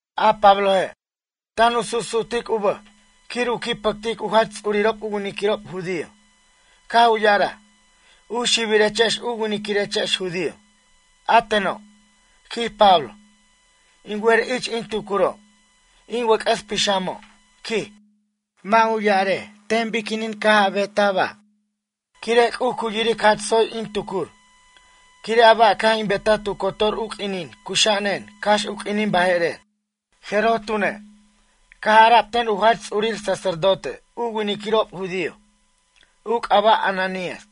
A Pabloje', tan u susu'tic u bʌj quir u qui' pʌctic u jach ts'urirob u winiquirob judío. Caj u ya'araj: ―U xibirechex u winiquirechex judío. A teno' ―quij Pablo―, in wer ich in tucuro', in wʌc'ʌs pixamo' ―quij―, mʌ' u ya'arej ten biquinin caj a betaj ba', quire' C'uj cu yiric jach tsoy in tucur, quire' a ba' caj in betaj tu cotor u q'uinin cuxa'anen cax u q'uinin baje'rer. Jeroj tune', caj ara'b ten u jach ts'urir sacerdote u winiquirob judío, u c'aba' Ananías: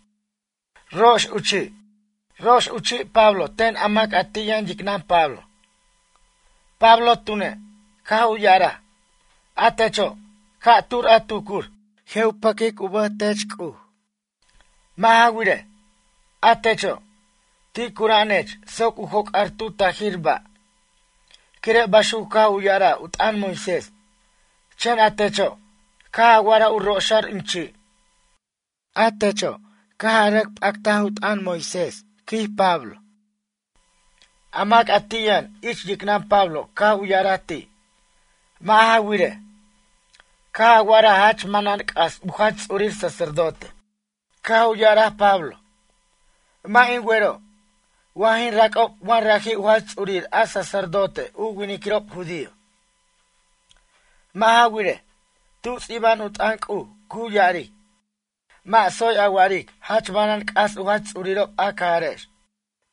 ―Rax u chi'. Rox u chi' Pablo ten a mac a ti' yʌn yicnʌn Pablo. Pablo tune', caj u ya'araj: ―A techo', ca'tur a tucur, je' u pʌquic u bʌj tech C'uj. Mʌ' ja wirej, a techo', ti' cura'anech soc u joc'ar tu tajir ba', quire' baxuc caj u ya'araj u t'ʌn Moisés. Chen a techo', caj a wa'araj u roxar in chi'. A techo', caj a rʌc p'act u t'ʌn Moisés ―quij Pablo. A mac a ti' yʌn ich yicnʌn Pablo caj u ya'araj ti': ―Mʌ' ja wirej, caj a wa'araj jach manan c'as u jach ts'urir sacerdote. Caj u ya'araj Pablo: ―Mʌ' in wero', wa jin rac'ob wa raji' u jach ts'urir a sacerdote u winiquirob judío. Mʌ' ja wirej, tu ts'iba'an u t'ʌn C'uj cu ya'aric: “Mʌ' tsoy a wa'aric jach manan c'as u jach ts'urirob a cajarex.”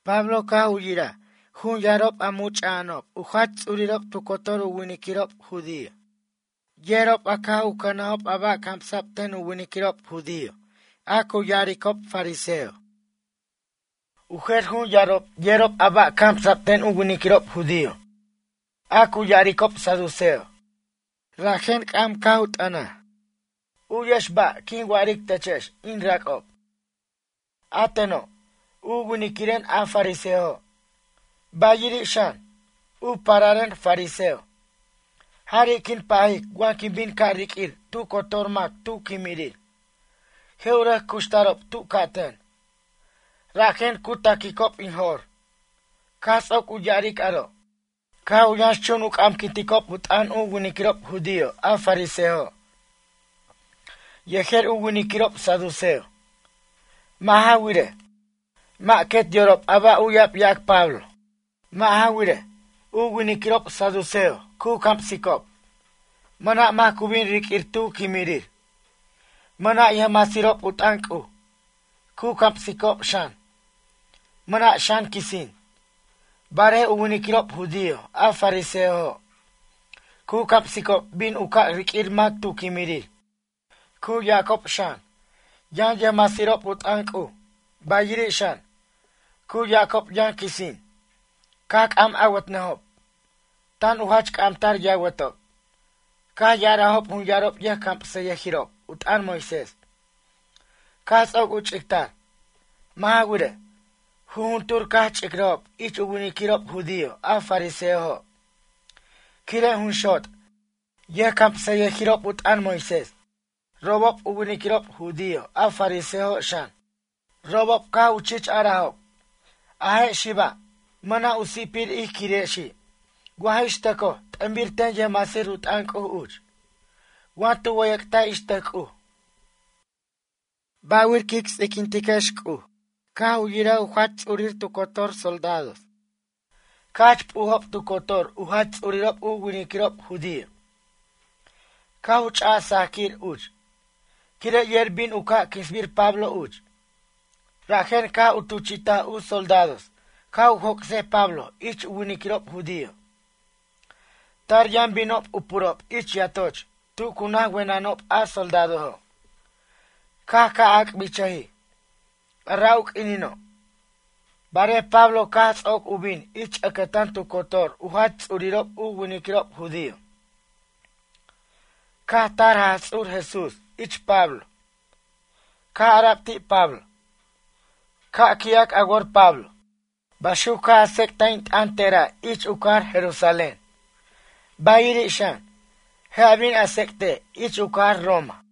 Pablo caj u yiraj jun yarob a much'a'anob u jach ts'urirob tu cotor u winiquirob judío. Yerob a caj u cʌnajob a ba' camsa'b ten u winiquirob judío a cu ya'aricob fariseo. U jer jun yarob yerob a ba' camsa'b ten u winiquirob judío a cu ya'aricob saduceo. Rajen c'am caj u t'ʌnaj: ―U'yex ba' quin wa'aric techex in rac'ob. A teno', u winiquiren a fariseojo', bayiri' xan, u pararen fariseo. Jari' quin pajic wa bin u ca' riq'uir tu cotor mac tu quimirir. Je' u rʌc cuxtarob tu ca'ten, rajen cu taquicob in jo'r. Caj ts'oc u ya'aric aro', caj u yʌnxchun u c'amquinticob u t'ʌn u winiquirob judío a fariseojo' yejer u winiquirob saduceo. Mʌ' ja wirej, mʌ' quet yorob a ba' uya'b yac Pablo. Mʌ' ja wirej, u winiquirob saduceo cu camsicob, mʌna' mac cu bin riq'uir tu quimirir, mʌna' u yʌjmasirob u t'ʌn C'uj, cu camsicob xan, mʌna' xan quisin. Barej u winiquirob judío a fariseojo', cu camsicob bin u ca' riq'uir mac tu quimirir. Cu yacob xan, yʌn yʌjmasirob u t'ʌn C'uj, bayiri' xan, cu yacob yʌn quisin. Caj c'am awʌtnʌjob, tan u jach c'amtar yawʌtob. Caj ya'arajob jun yarob yʌjcamsʌyʌjirob u t'ʌn Moisés, caj ts'oc u ch'ictar. Mʌ' ja wirej, jujuntur caj ch'icrʌjob ich u winiquirob judío a fariseojo', quire' jun xot' yʌjcamsʌyʌjirob u t'ʌn Moisés, robob u winiquirob judío a fariseojo' xan. Robob caj u chich arajob: ―A je' xiba', mʌna' u si'pir ij quirexi' wa ix tʌcoj t'ʌnbir ten yʌjmasir u t'ʌn C'uj uch. Wa tu wʌyʌc't ix tʌc C'uj. Ba'wir quic ts'iquintiquex C'uj. Caj u yiraj u jach ts'urir tu cotor soldados caj jach p'ujob tu cotor u jach ts'urirob u winiquirob judío, caj u ch'aj sajquir uch, quire' yer bin u ca' quinsbir Pablo uch. Rajen caj u tuchi'taj u soldados ca' u joc'sej Pablo ich u winiquirob judío. Tar yʌn binob u purob ich yatoch tu cu naj wenʌnob a soldadojo'. Caj ca' ac'bichʌjij, a ra' u q'uinino', barej Pablo caj ts'oc u bin ich ʌcʌtan tu cotor u jach ts'urirob u winiquirob judío caj tar Jaj Ts'ur Jesús ich Pablo. Caj ara'b ti' Pablo: ―Ca' qui'ac a wor Pablo. Baxuc caj a tsec'taj in t'ʌn tera' ich u cajar Jerusalén, bayiri' xan, je' a bin a tsec'tej ich u cajar Roma.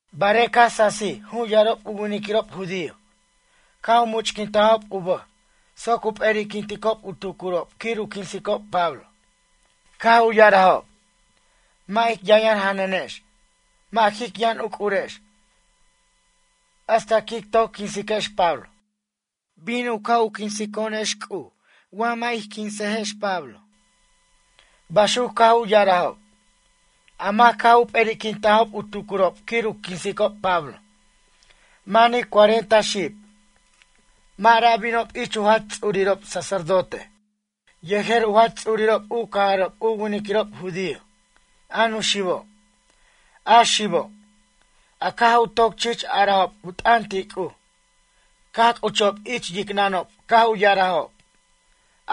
Barej caj sasij jun yarob u winiquirob judío, caj u much'quintajob u bʌj soc u p'eri'quinticob u tucurob quir u quinsicob Pablo. Caj u ya'arajob: ―Mʌ' ic yʌnyʌn janʌnex mʌ' jic yʌn uc'urex hasta quic toc quinsex Pablo. Bin u ca' u quinso'onex C'uj wa mʌ' ic quinsejex Pablo ―baxuc caj u ya'arajob. A mac a caj u p'eri'quintajob u tucurob quir u quinsicob Pablo manij cuarenta xib. Mʌ' ra' binob ich u jach ts'urirob sacerdote yejer u jach ts'urirob u cajarob u winiquirob judío, a nuxibo', a xibo', a caj u toc chich arajob u t'ʌn ti' C'uj. Caj c'uchob ich yicnʌnob caj u ya'arajob: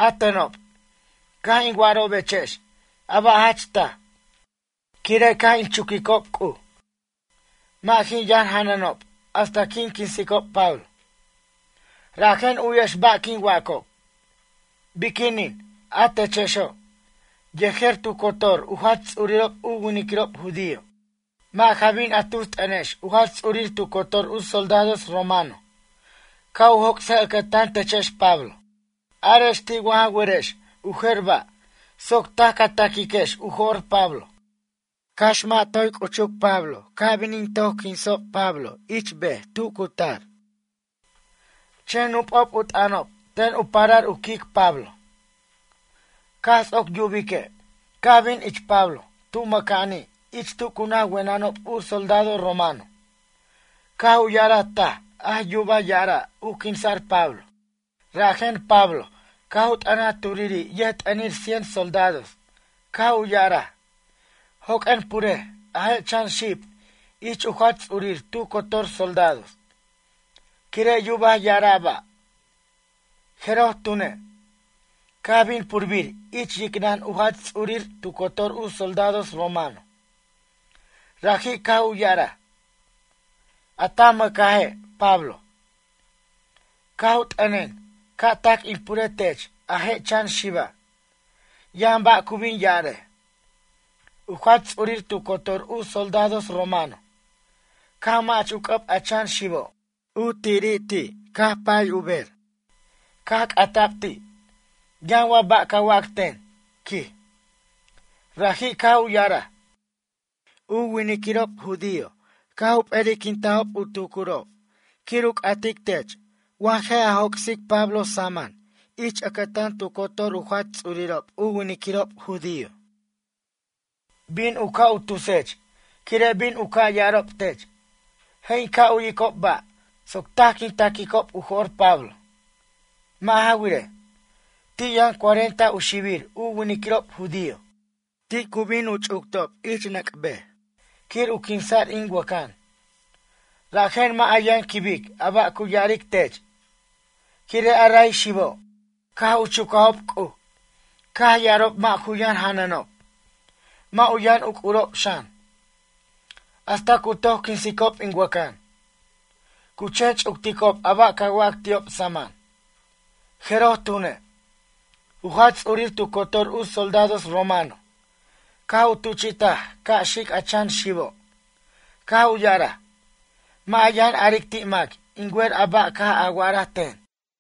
―A tenob, caj in wa'arobechex a ba' jach taj, quire' caj in chuquicob C'uj. Mʌ' jin yʌn janʌnob hasta quin quinsicob Pablo. Rajen u'yex ba' quin wacob. Biquinin a techexo', yejer tu cotor u jach ts'urirob u winiquirob judío mʌ' ja bin a tus t'ʌnex u jach ts'urir tu cotor u soldados romano ca' u joc'sej ʌcʌtan techex Pablo. Arex ti' wa ja werex u jer ba' soc taj ca taquiquex u jo'r Pablo. Cax mʌ' toy c'uchuc Pablo a ca' bin in toc quinsob Pablo ich ber tu cu tar. Chen nup'ob u t'ʌnob ten u parar u quic Pablo. Caj ts'oc yubique', caj bin ich Pablo tu mʌca'ani' ich tu cu naj wenʌnob u soldado romano. Caj u ya'araj taj a yubaj ya'ara' u quinsa'r Pablo. Rajen Pablo caj u t'ʌnaj turiri' yʌjt'ʌnir cien soldados caj u ya'araj: ―Joq'uen purej a je' chan xib ich a jach ts'urir tu cotor soldados, quire' yubaj ya'ara' ba'. Jeroj tune', caj bin purbir ich yicnʌn u jach ts'urir tu cotor u soldados romano. Raji' caj u ya'araj: ―A ta mʌcaje' Pablo, caj u t'ʌnen ca' tac in pure tech a je' chan xiba'. Yʌn ba' cu bin ya'arej. U jach ts'urir tu cotor u soldados romano, caj mach u c'ʌb a chan xibo'. U tirir ti' caj u pay u ber. Caj c'ata'b ti': ―Yʌn wa ba' ca wac ten? ―quij. Raji' caj u ya'araj: ―U winiquirob judío caj u p'eri'quintajob u tucurob quir u c'atic tech wa ja joc'sej Pablo saman ich ʌcʌtan tu cotor u jach ts'urirob u winiquirob judío. Bin u ca' u tusech quire' bin u ca' ya'arob tech: “Je' in ca' u'yicob ba' soc taj quin taquicob u jo'r Pablo.” Mʌ' ja wirej, ti' yʌn cuarenta u xibir u winiquirob judío ti' cu bin u ch'uctob ich nʌc' ber quir u quinsa'r in wʌcʌn. Rajen mʌ' a yʌn quibic a ba' cu ya'aric tech, quire' a ray xibob, caj u chucajob c'uj caj ya'arob mʌ' ju yʌn janʌnob, mʌ' u yʌn yuc'urob xan, hasta cu toc quinsicob in wʌcan. Cu chen ch'ucticob a ba' ca wac ti'ob saman. Jeroj tune', u jach ts'urir tu cotor u soldados roman caj u tuchi'taj ca' xic a chan xibo', caj u ya'araj: ―Mʌ' a yʌn aric ti' mac in wer a ba' caj a wa'araj ten.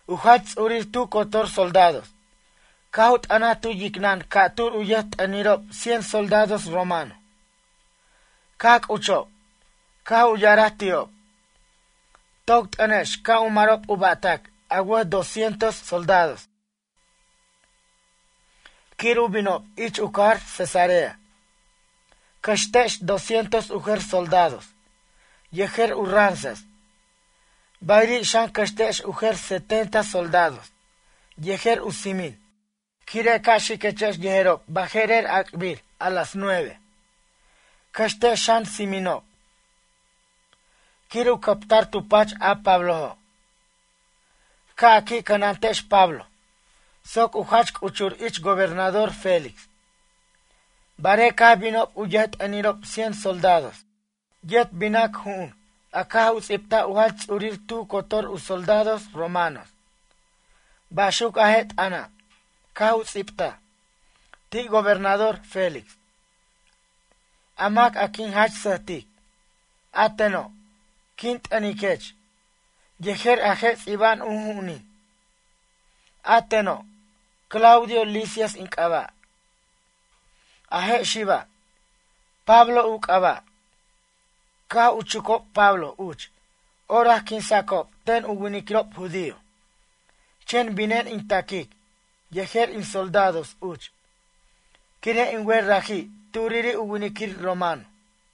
U jach ts'urir tu cotor soldados caj u t'ʌnaj tu yicnʌn ca'tur u yʌjt'ʌnirob cien soldados romano. Caj c'uchob caj u ya'araj ti'ob: ―Toc t'ʌnex ca' u marob u ba'tac a wʌj doscientos soldados, quir u binob ich u cajar Cesarea. Cʌxtex doscientos u jer soldados yejer u ranzas, bayiri' xan cʌxtex u jer setenta soldados yejer u tsimin. Quire' ca' xiquechex yejerob baje'rer ac'bir a las nueve. Cʌxtex xan tsiminob, quir u cʌptar tu pach a Pablojo'. Ca' a qui' cʌnantex Pablo soc u jach c'uchur ich gobernador Félix. Barej caj binob u yʌjt'ʌnirob cien soldados yet binac ju'un a caj u ts'ibtaj u jach ts'urir tu cotor u soldados romanos. Baxuc a je' t'ʌna', caj u ts'ibtaj: “Ti' gobernador Félix, a mac a quin jach sʌjtic. A teno', quin t'ʌniquech yejer a je' ts'iba'an u ju'unin. A teno', Claudio Lisias in c'aba'. A je' xiba', Pablo u c'aba'. Caj u chucob Pablo uch orac quinsa'cob ten u winiquirob judío. Chen binen in taquic yejer in soldados uch, quire' in wer raji' turiri' u winiquir romano.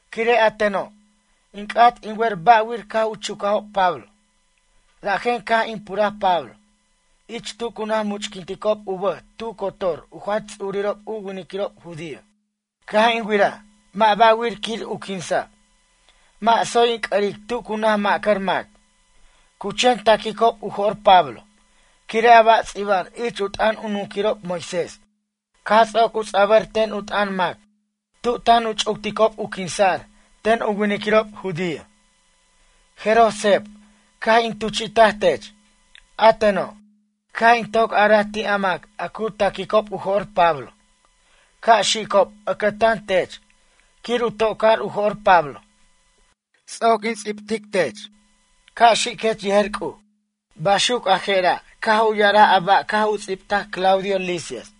Quire' a teno', in c'at in wer ba'wir caj u chucajob Pablo, rajen caj in puraj Pablo ich tu cu naj much'quinticob u bʌj tu cotor u jach ts'urirob u winiquirob judío. Caj in wiraj mʌ' ba'wir quir u quinsa', mʌ' tsoy in c'ʌric tu cu naj mʌ'car mac. Cu chen taquicob u jo'r Pablo quire' a ba' ts'iba'an ich u t'ʌn u nunquirob Moisés. Caj ts'oc u ts'abʌr ten u t'ʌn mac tu tan u ch'ucticob u quinsa'r ten u winiquirob judío, jeroj seb caj in tuchi'taj tech. A teno', caj in toc araj ti' a mac a cu taquicob u jo'r Pablo ca' xicob ʌcʌtan tech quir u to'car u jo'r Pablo. Ts'oc in ts'ibtic tech. Ca' xiquech yejer C'uj.” Baxuc a jera' caj u ya'araj a ba' caj u ts'ibtaj Claudio Lisias.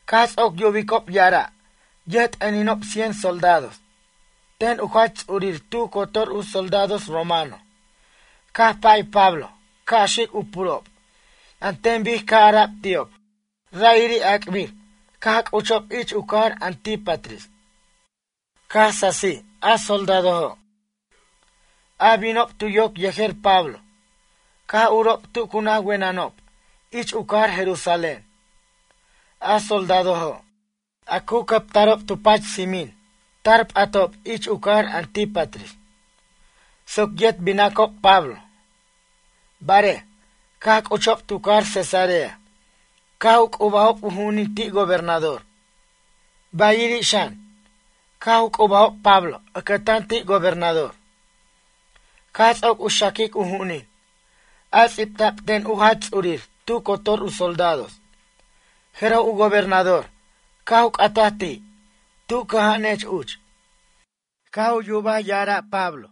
Caj ts'oc yubicob ya'ara' yʌjt'ʌninob cien soldados ten u jach ts'urir tu cotor u soldados romano caj pay Pablo ca' xic u purob an ten bic caj ara'b ti'ob, ra'iri' ac'bir caj c'uchob ich u cajar Antípatris. Caj sasij a soldadojo', a binob tu yoc yejer Pablo caj urob tu cu naj wenʌnob ich u cajar Jerusalén. A soldadojo', a cu cʌptarob tu pach tsimin tar p'atob ich u cajar Antípatris soc yet binacob Pablo. Barej, caj c'uchob tu cajar Cesarea caj u c'ubajob u ju'unin ti' gobernador, bayiri' xan, caj u c'ubajob Pablo ʌcʌtan ti' gobernador. Caj ts'oc u xaquic u ju'unin, a ts'ibta'b ten u jach ts'urir tu cotor u soldados, jeroj u gobernador caj u c'ataj ti': “Tu cʌja'anech uch?” Caj u yubaj ya'ara' Pablo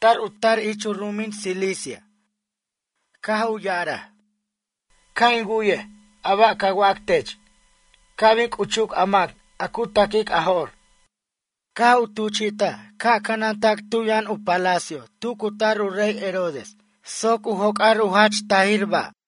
tar u tar ich u ru'umin Cilicia. Caj u ya'araj: ―Ca' in wu'yej a ba' ca wac tech, ca' bin c'uchuc a mac a cu ta'quic a jo'r. Caj u tuchi'taj ca' cʌnantac tu yʌn palacio nacional, tu cu cutar u rey Herodes soc u joc'ar u jach taj ba'.